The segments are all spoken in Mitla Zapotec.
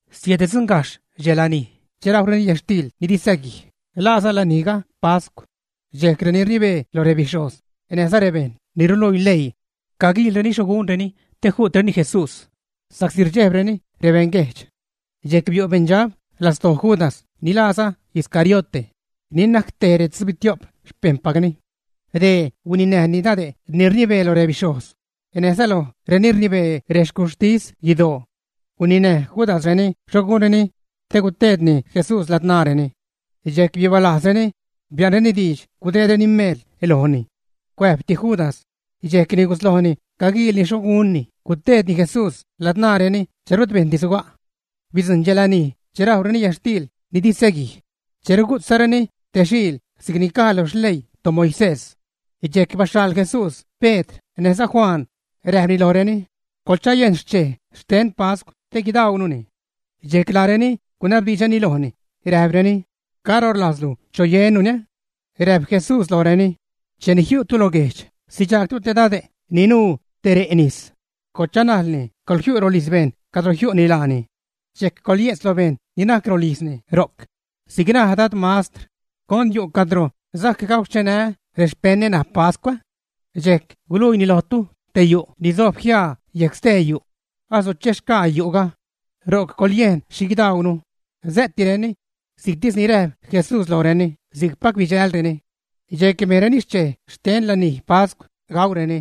Siäddzuṉgajxh dxe lanij che rajwreni yätxtiil ni di säguij, laaza lanijga pascw. Dxejc reni rnibee loj rebixhojz näjza rebejṉ ni ruluii leii caguiilreni xho gunreni te ju'treni Jesús, sa'csi rdxejbreni rebeṉguejdx. Dxejc biu' beṉdxab lastoo Judas ni laaza Iscariote, ni najc tej retzubitio'p xpejṉpacni. Dee huininäjni dade' ni rnibee loj rebixhojz näjza loj reni rnibee rexcuxhtis guidoo. Guninäj Judasreni xho gunni te guteedni Jesús ladzṉaareni. Dxejc bibalajzreni, bia'nreni diidx gudeedreni meel lojni. Cuäjbti Judas, dxejcni guslojni caguiilni xho gunni guteedni Jesús ladzṉaareni che rut bejṉdi suga'. Bidzujṉ dxe lanij che rajwreni yätxtiil ni di säguij, che rugu'tzareni te xiil si'c ni caj lo xleii toMoisés. Dxejc baxhaḻ Jesús Pedr näjza Juan, räjpni lojreni: ―Coḻchayejn xchej xten pascw te guidaununi. Dxejc laareni gunabdiidxreni lojni, räjpreni: ―¿Caro rlajzlu choyennuni? Räjp Jesús lojreni: ―Cheni jiu'tu lo guejdx, sidxaagtu te dade' ni nuu te re' nis. Coḻchanajlni, coḻjiu' rolijz bejṉ cadro jiu'ni laani. Dxejc coḻye'tz lo bejṉ ni najc rolijzni ro'c: “Si'c naj Dad Mastr: ¿Con yu' cadro sajc gauxchenää́ rexpeṉä ṉaj pascw?” Dxejc guluiini lojtu te yu' ni sojb jiaa yejc stee yu'. Asuchexgaa yu'ga. Ro'c coḻyejn xhi guidaunu. Sä'tireni. Si'ctis ni räjp Jesús lojreni, si'cpac bidxälreni. Dxejc bejnreni xchej xte lanij pascw gaureni.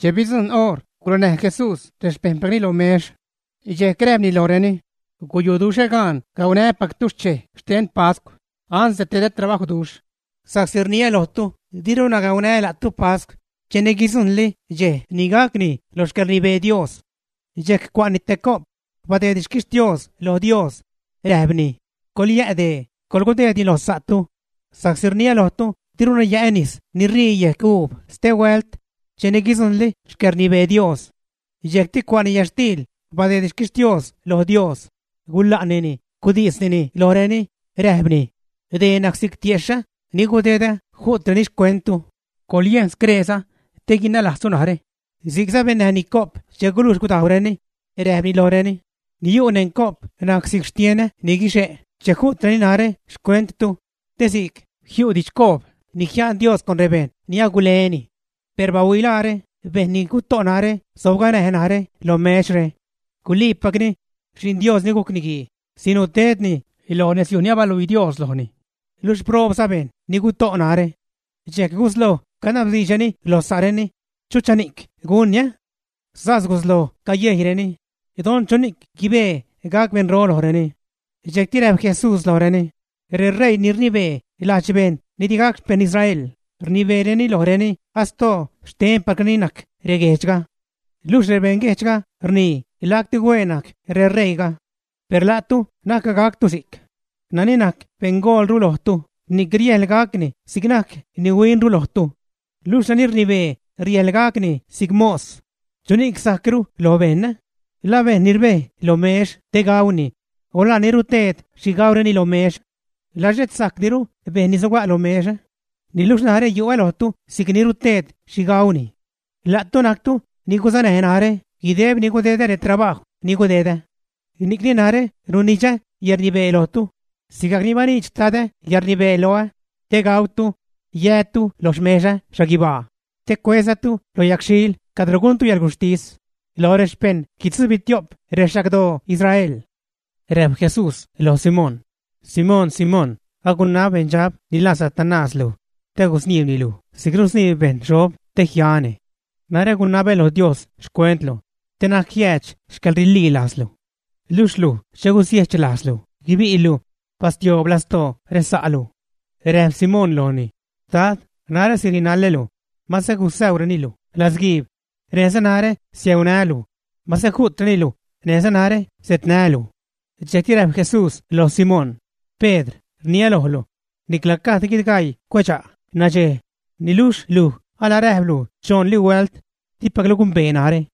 Che bidzujṉ oṟ, gurenäj Jesús rexpejṉpacni lo mex. Dxejc räjpni lojreni: ―Guyuduxhä gaan gaunää́pactu xchej xten pascw ansde tedä trabajwduxh. Sa'csi rniä lojtu, diruna gaunää́ la'tu pascw cheni guidzujṉli dxej ni gacni lo xcäḻrnibee Dios. Dxejc cua'ni te co'p, badeedni xquixtios lo Dios, räjpni: ―Coḻyä' dee, coḻgudeedni lo sa'tu. Sa'csi rniä lojtu, diruna yä'ä nis ni rii yejc uub stehuält cheni guidzujṉli xcäḻrnibee Dios. Dxejcti cua'ni yätxtiil, badeedni xquixtios loj Dios, gula'nini, gudisnini lojreni, räjpni: ―Dee najc si'c tiexhä ni gudedä ju'treni xcuenttu. Coḻyejn screeza te guinalajztu narä. Si'cza bennäjni co'p che gulujx gudajwreni, räjpni lojreni: ―Ni yu' neṉ co'p najc si'c xtienä ni guixe' che ju'treni narä xcuenttu te si'c jiu' didxcoob ni jia'n Dios con rebejṉ ni aguleni. ’Per bahuilaare, bejṉ ni guto' narä sobganäj narä lo mexre. Guliipacni, Xi'n Dios ni gujc Niguii sinuu tedni loj nezyuj ni abaluii Dios lojni. Luxh proobza bejṉ ni guto' narä. Dxejc gusloj canabdiidxreni lo sa'reni, ¿chuchani'c gunni? Sas gusloj cayejyreni, don chuni'c guibee gac beṉro lojreni. Dxejcti räjp Jesús lojreni: ―Reṟeii ni rnibee lajdx bejṉ ni digac xpejṉ Israel, rnibeereni lojreni astoo xtenpacreni najc reguejdxga. Luxh rebeṉguejdxga rnii lacti hueen najc reṟeiiga. Per la'tu na'c gactu si'c. Nani najc beṉgoolru lojtu, ni'c riäjḻ gacni si'c najc ni huinru lojtu. Luxh nani rnibee riäjḻ gacni si'c mos. ¿Chuni'c sajcru lo bejṉ? ¿La bejṉ ni rbej lo mex te gauni o la ni ruteed xhi gaureni lo mex? ¿La xhet sajcdiru bejṉ ni sojb lo mex, ä? Niluxh narä yu'ä lojtu si'c ni ruteed xhi gauni. ’La'tu najctu ni gusunäj narä guideb ni gudedä retrabajw ni gudedä. Ni'cni narä runidxä yäḻrnibee lojtu sigajc ni baniidx xtad yäḻrnibee loä, te gautu, yätu lo xmexä xhaguibaa, te cuezatu lo yagxhil cadro guntu yäḻguxhtis loj rexpejṉ guitzubitio'p rexagdoo Israel. Räjp Jesús loj Simón: ―Simón, Simón, agunab beṉdxab ni laa Satanás luj te gusniibni luj si'c rusniib bejṉ xob te jiani. Narä agunabä lo Dios xcuentlu te na'c jiäädx xcäḻrililajzlu. Luxh luj che gusiejch lajzlu, guibi'lu, bastioob lastoo resa'lu. Räjp Simón lojni: ―Dad, narä sirinalälu; mase gusäureni luj latzguiib, näjza narä siäunää́lu; mase ju'treni luj, näjza narä setnää́lu. Dxejcti räjp Jesús loj Simón: ―Pedr, rniä lojlu, nicla gajd guidgaii cuedxa' nadxej niluxh luj alaräjplu choṉli huält, dipaclu gumbee narä.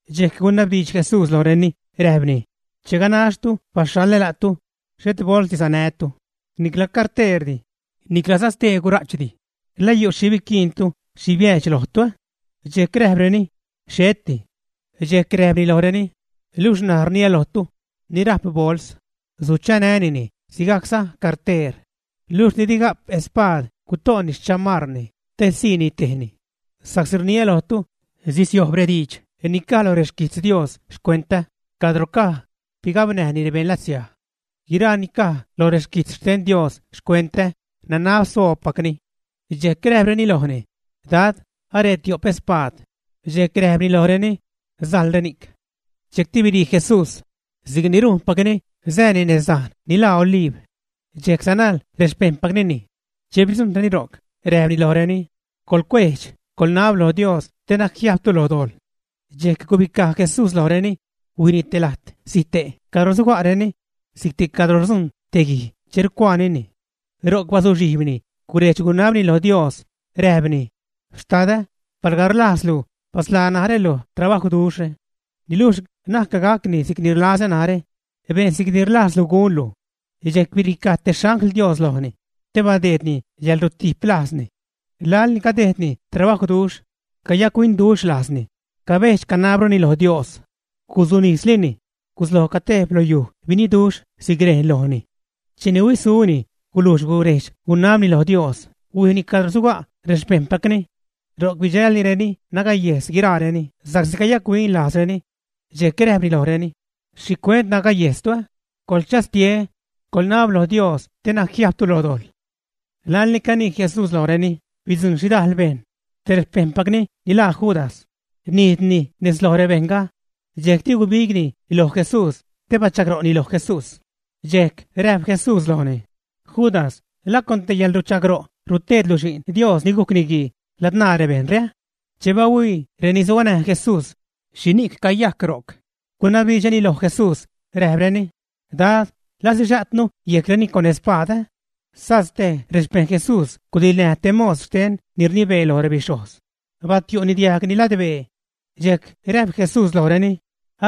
Dxejc gunabdiidx Jesús lojreni räjpni: ―Che ganaxtu baxhaḻä la'tu, xhet bolsdi sanätu, nicla carteerdi, niclaza stee gura'chdi, ¿la yu' xhi biquiintu, xhi biäädx lojtu, ä? Dxejc räjpreni: ―Xheti. Dxejc räjpni lojreni: ―Luxh ṉaj rniä lojtu, ni rajp bols, suchanänini; sigajcza carteer. Luxh ni di ga'p espaad, guto'ni xchamarni te siini tejni. Sa'csi rniä lojtu, sisiojb rediidx ni caj lo requijtz Dios xcuentä, cadro caj: “Bigabnäjni rebeṉ latsiaj.” Guiraa ni caj lo reguijtz xten Dios xcuentä nanab soobpacni. Dxejc räjpreni lojni: ―Dad, aree tio'p espaad. Dxejc räjpni lojreni: ―Sajl reni'c. Dxejcti birii Jesús, si'cni rujnpacni, sääni nez dajn ni laa Oliib. Dxejc sanajl rexpejṉpacni. Che bidzujṉreni ro'c, räjpni lojreni: ―Coḻcuejdx, coḻnab lo Dios te na'c jiajbtu lo dojḻ. Dxejc gubicaj Jesús lojreni, huijni te lajt zite' cadro suga'reni, si'cti cadro rdzujṉ te guij che rucuaanini. Ro'c bazuxhijbni, gurejdx-gunabni lo Dios, räjpni: ―Xtadä, palga rlajzlu, basḻaa narä loj trabajwduxhre. Niluxh na'c gacni si'c ni rlazä narä. Bejn si'cni rlajzlu gunlu. Dxejc biricaj te xangl Dios lojni te badeedni yäḻrutiplajzni. Laḻni cadejdni trabajwduxh, cayac-huinduxh lajzni, cabedx-canabruni lo Dios. Guzunislini gusloj catejb lo yuj biniduxh si'c rejn lojni. Cheni huisuni, gulujx gurejdx-gunabni lo Dios, huijni cadro suga' rexpejṉpacni. Ro'c bidxälnireni nagayejs guiraareni sa'csi cayac-huin lajzreni. Dxejc räjpni lojreni: ―¿Xhicuent nagayejstu? ¡Coḻchastie! ¡Coḻnab lo Dios te na'c jiajbtu lo dojḻ! Laḻ ni canii Jesús lojreni, bidzujṉ xhidajl bejṉ. Tej rexpejṉpacni ni laa Judas, nijdni nez loj rebejṉga. Dxejcti gubigni loj Jesús, te bachagro'ni loj Jesús. Dxejc räjp Jesús lojni: ―Judas, ¿la con te yäḻruchagro' ruteedlu Xi'n Dios ni gujc Niguii ladzṉaa rebejṉre, ä? Che bahuii reni suganäj Jesús xhini'c cayajc ro'c, gunabdiidxreni loj Jesús, räjpreni: ―Dad, ¿la sixa'tnu yejcreni con spaad, ä? Sas tej rexpejṉ Jesús gudiḻnäj te mos xten ni rnibee loj rebixhojz, batiu'ni diajgni ladbee. Dxejc räjp Jesús lojreni: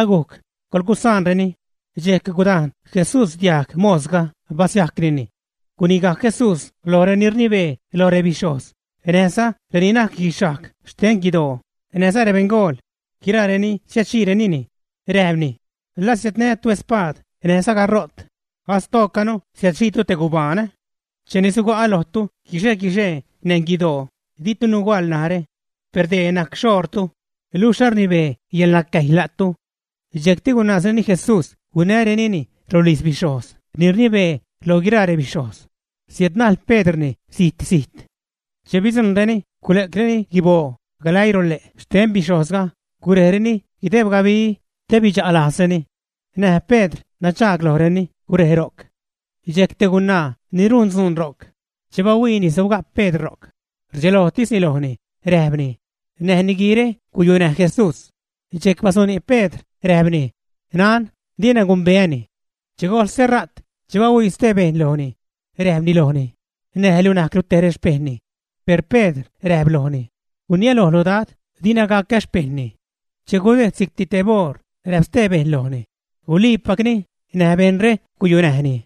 ―¡Agujc! ¡Coḻgusaanreni! Dxejc gudajn Jesús diajg mosga, basiajcnini. Gunigajc Jesús loj reni rnibee loj rebixhojz näjza reni najc guixhajg xten guidoo näjza rebeṉgool, guiraa reni siädxiinini, räjpni: ―¿La siädnätu spaad näjza garo't, astoocanu siädxiitu te gubaan, ä? Cheni suga'a lojtu guixe-guixee neṉ guidoo, ditu nuhuaḻ narä. Per dee najc xoṟtu, luxh arnibee yäḻnacäjy la'tu. Dxejcti gunaazreni Jesús huinärenini rolijz bixhojz ni rnibee lo guiraa rebixhojz. Siädnäjl Pedrni zit-zijt. Che bidzujṉreni gule'creni guiboo galäii lole' xten bixhojzga, gurejreni guideb gabi, te bidxa' lajzreni. Näj Pedr nadxaag lojreni gurej ro'c. Dxejc te gunaa ni rujn dzuun ro'c, che bahuiini sobga' Pedr ro'c, rdxelojtisni lojni, räjpni: ―Näj niguiire guyunäj Jesús. Dxejc basuni' Pedr räjpni: ―Nan, dina gumbeäni. Che gojl stera't, che bahuii stee bejṉ lojni, räjpni lojni: ―Näj luj najclu te rexpejṉni. Per Pedr räjp lojni: ―Gurniälojlu, Dad, dina gacä xpejṉni. Che gudejd si'cti teb oṟ, räjp stee bejṉ lojni: ―Guliipacni, näj bejṉre guyunäjni,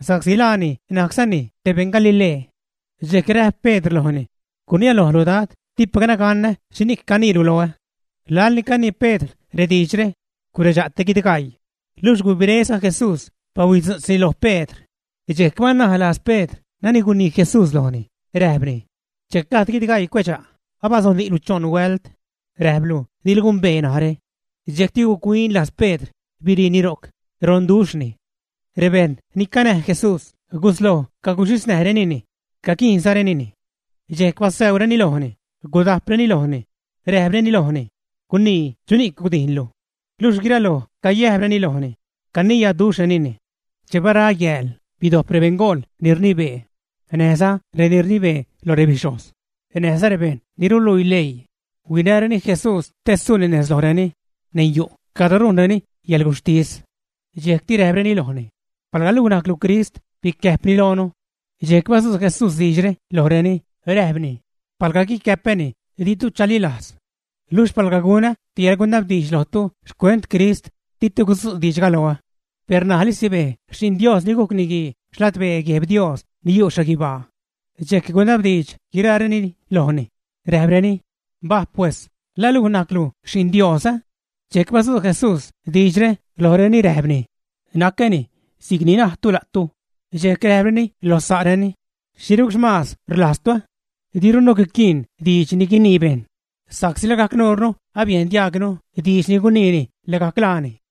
sa'csi laani najczani te beṉ Galilee. Dxejc räjp Pedr lojni: ―Gurniälojlu Dad, dipacna ganä xhini'c caniilu loä. Laḻni canii Pedr rediidxre, guredxa' te guidgaii, luxh gubiréza Jesús, bahuidzu'tzni lo Pedr, dxejc banalajz Pedr nani gunii Jesús lojni, räjpni: “Che gajd guidgaii cuedxa', abazuni'lu choṉ huält, räjplu dilu gumbee najrä.” Dxejcti guc-huin lajz Pedr, biriini ro'c, ronduxhni. Rebejṉ ni canäj Jesús, gusloj caguxhisnäjrenini, caguijnzarenini. Dxejc basäureni lojni, gudajpreni lojni, räjpreni lojni: ―¡Gunii chuni'c gudijnlu! Luxh guiraloj cayäjbreni lojni, caniyaduxhrenini. Che bara yääl, bidojp rebeṉgool ni rnibee, näjza reni rnibee loj rebixhojz, näjza rebejṉ ni ruluii leii, huinäreni Jesús te suuni nez lojreni neṉ yu' cadro rujnreni yäḻguxhtis. Dxejcti räjpreni lojni: ―Palga luj najclu Crist, bicäjpni loonu. Dxejc badzu' Jesús diidxre lojreni, räjpni: ―Palga guicäpäni, ditu chalilajz. Luxh palga gunä te yäḻgunabdiidx lojtu xcuent Crist, ditu gudzu' diidxga loä. Per ṉajli sibej Xi'n Dios ni gujc Niguii xladbee Gueb Dios ni yu' xhaguibaa. Dxejc gunabdiidx guiraareni lojni, räjpreni: ―Mbaj pues, ¿la luj najclu Xi'n Dios, ä? Dxejc badzu' Jesús diidxre lojreni räjpni: ―Nacäni, si'cni najtu la'tu. Dxejc räjpreni lo sa'reni: ―¿Xhirucxhamaaz rlajztu? Dirunu guiquiin diidx guinii bejṉ, sa'csi lagajc nuurnu abiejn diajgnu diidx ni guniini lagajc laani.